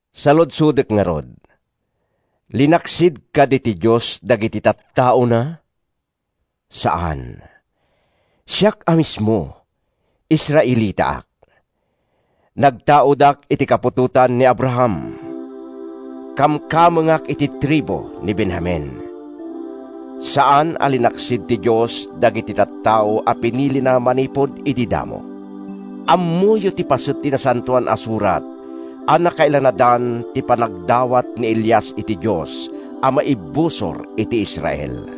Saludsodek ngarud: Linaksid kadi ti Dios dagiti tattaona? Saan! Siak a mismo, Israelitaak. Nagtaudak iti kaputotan ni Abraham. Kamkamengak iti tribu ni Benjamin. Saan a linaksid ti Dios dagiti tattao a pinilina manipud idi damo. Ammoyo ti paset ti Nasantoan a Surat a nakailanadan ti panagdawat ni Elias iti Dios a maibusor iti Israel.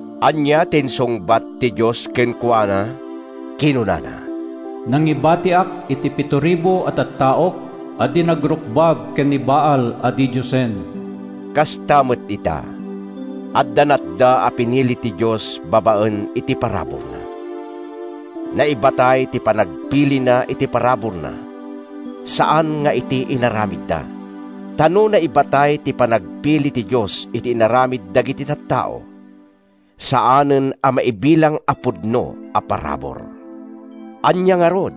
Ania ti insungbat ti Dios kenkuana? Kinunana, “Nangibatiak iti pitoribu a tattaok a di nagrukbab ken ni Baal a didiosen.” Kasta met ita: adda natda a pinili ti Dios babaen iti paraburna. Naibatay ti panagpilina iti paraburna, saan nga iti inaramidda. Ta no naibatay ti panagpili ti Dios iti inaramid dagiti tattao, saanen a maibilang a pudno a parabur. Ania ngarud?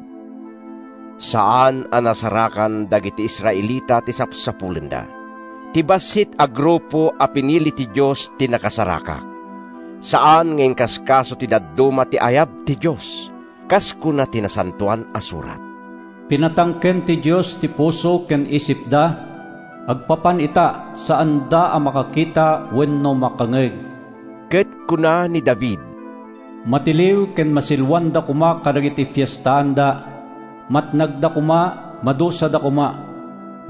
Saan a nasarakan dagiti Israelita ti sapsapulenda. Ti bassit a grupo a pinili ti Dios ti nakasarak. Saan nga inkaskaso ti dadduma ti ayab ti Dios. Kas kuna ti Nasantoan a Surat, “Pinatangken ti Dios ti puso ken isipda. Agpapan ita, saanda a makakita wenno makangngeg.” Ket kuna ni David: “Matiliw ken masiloanda koma kadagiti fiestaanda; Matnagda koma, madusada koma!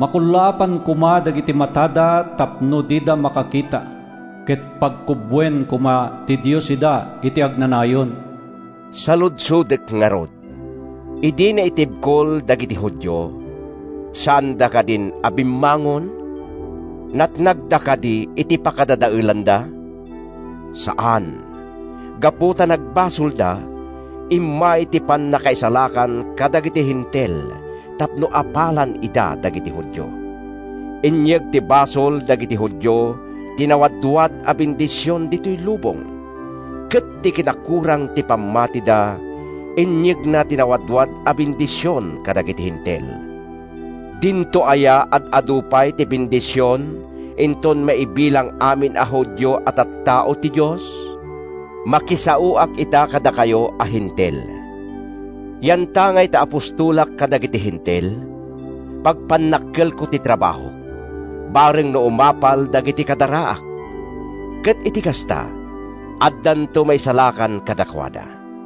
Makullaapan koma dagiti matada tapno dida makakita; Ket pagkubboen koma ti Dios ida iti agnanayon.” Saludsodek ngarud: Idi naitibkol dagiti Judio, saanda kadin a bimmangon? Natnagda kadi iti pakadadaelanda? Saan! Gapu ta nagbasolda, immay ti pannakaisalakan kadagiti Hentil tapno apalan ida dagiti Judio. Inyeg ti basol dagiti Judio ti nawadwad a bendision ditoy lubong, ket ti kinakurang ti pammatida inyegna ti nawadwad a bendision kadagiti Hentil. Dinto aya ad-adu pay ti bendision inton maibilang amin a Judio a tattao ti Dios? Makisaoak ita kadakayo a Hentil. Yantangay ta apostolak kadagiti Hentil, pagpannakkelko ti trabahok bareng no umapal dagiti kadaraak, ket iti kasta, addanto maisalakan kadakuada.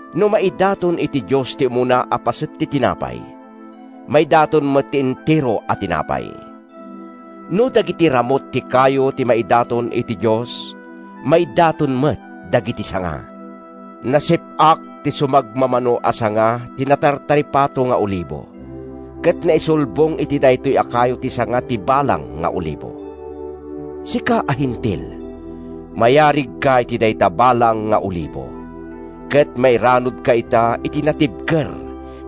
No maidaton iti Dios ti umuna a paset ti tinapay, maidaton met ti entero a tinapay. No dagiti ramut ti kayo ti maidaton iti Dios, maidaton met dagiti sanga. Nasip-ak ti sumagmamano a sanga ti natartaripato nga olibo, ket naisulbong iti daytoy a kayo ti sanga ti balang nga olibo. Sika a Hentil, mayarigka iti dayta balang nga olibo, ket mairanudka ita iti natibker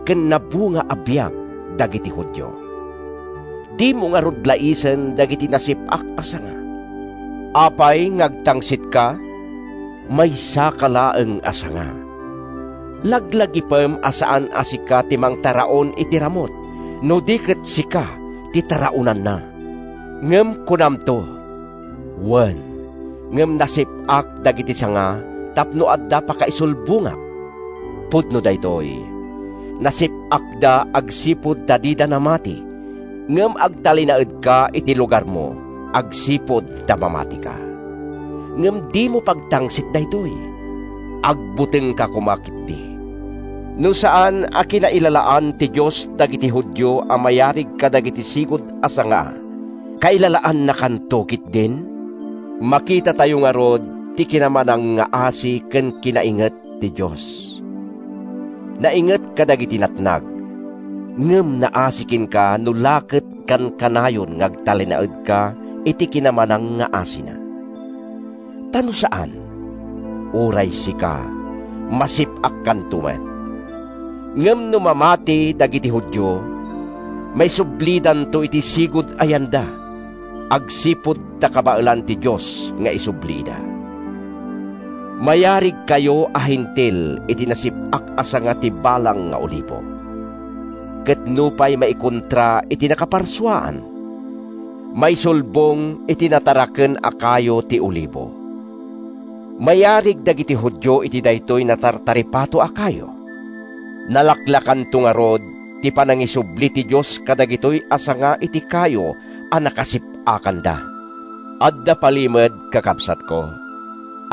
ken nabunga a biag dagiti Judio. Dimo ngarud laisen dagiti nasip-ak a sanga. Apay nga agtangsitka? Maysaka laeng a sanga. Laglagipem a saan a sika ti mangtaraon iti ramut, no di ket sika ti taraonanna. Ngem kunamto, “Wen, ngem nasip-ak dagiti sanga tapno adda pakaisulbongak.” Pudno daytoy. Nasip-akda agsipud ta dida namati, ngem agtalinaedka iti lugarmo agsipud ta mamatika. Ngem dimo pagtangsit daytoy. Agbutengka koma ketdi. No saan a kinailalaan ti Dios dagiti Judio a mayarig kadagiti sigud a sanga, kailalaannakanto ketdin? Makitatayo ngarud ti kinamanangngaasi ken kinainget ti Dios. Nainget kadagiti natnag, ngem naasi kenka no la ket kankanayon nga agtalinaedka iti kinamanangngaasina. Ta no saan, uray sika, masip-akkanto met. Ngem no mamati dagiti Judio, maisublidanto iti sigud a yanda, agsipud ta kabaelan ti Dios nga isubli ida. Mayarigkayo a Hentil iti nasip-ak a sanga ti balang nga olibo, ket nupay maikontra iti nakaparsuaan, maisulbong iti nataraken a kayo ti olibo. Mayarig dagiti Judio iti daytoy natartaripato a kayo. Nalaklakanto ngarud ti panangisubli ti Dios kadagitoy a sanga iti kayo a nakasip-akanda. Adda palimed, kakabsatko,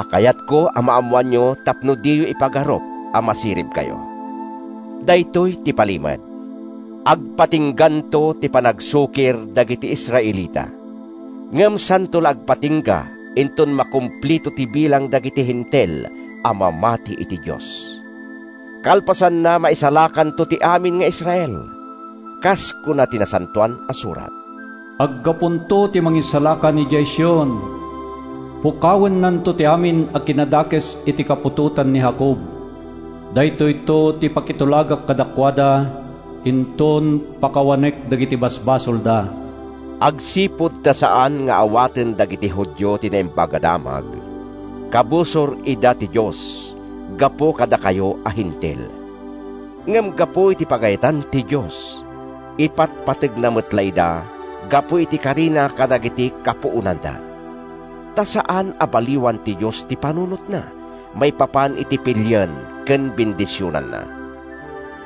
a kayatko a maammoanyo tapno diyo ipagarup a masiribkayo. Daytoy ti palimed: Agpatingganto ti panagsukir dagiti Israelita, ngem santo la agpatingga inton makompleto ti bilang dagiti Hentil a mamati iti Dios. Kalpasanna, maisalakanto ti amin nga Israel. Kas kuna ti Nasantoan a Surat: “Aggapunto ti Mangisalakan idiay Sion, pukawennanto ti amin a kinadakes iti kaputotan ni Jacob. Daytoyto ti pakitulagak kadakuada, inton pakawanek dagiti basolda.” Agsipud ta saan nga awaten dagiti Judio ti Naimbag a Damag, kabusor ida ti Dios gapu kadakayo a Hentil. Ngem gapu iti pagayatan ti Dios, ipatpategna met la ida gapu iti karina kadagiti kapuonanda. Ta saan a baliwan ti Dios ti panunotna maipapan iti pilien ken bendisionanna.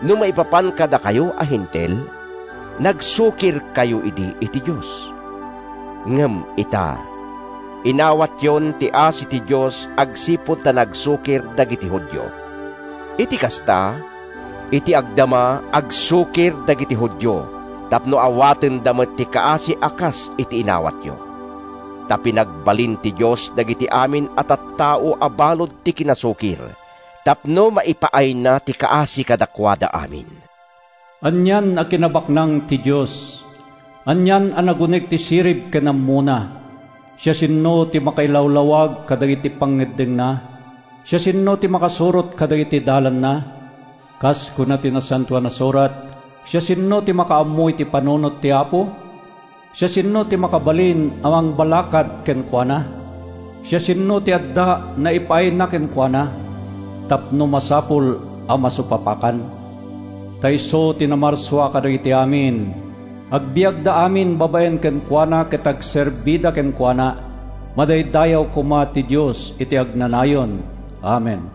No maipapan kadakayo a Hentil, nagsukirkayo idi iti Dios. Ngem ita, inawatyon ti asi ti Dios agsipud ta nagsukir dagiti Judio. Iti kasta, iti agdama, agsukir dagiti Judio tapno awatenda met ti kaasi a kas iti inawatyo. Ta pinagbalin ti Dios dagiti amin a tattao a balud ti kinasukir tapno maipaayna ti kaasi kadakuada amin. Anian a kinabaknang ti Dios! Anian a naguneg ti sirib ken ammona! Siasino ti makailawlawag kadagiti pangngeddengna? Siasino ti makasurot kadagiti dalanna? Kas kuna ti Nasantoan a Surat: “Siasino ti makaammo iti panunot ti Apo? Siasino ti makabalin a mangbalakad kenkuana? Siasino ti adda naipaayna kenkuana, Tapno masapul a masupapakan?” Ta isu ti namarsua kadagiti amin. Agbiagda amin babaen kenkuana ket agserbida kenkuana. Madaydayaw koma ti Dios iti agnanayon! Amen.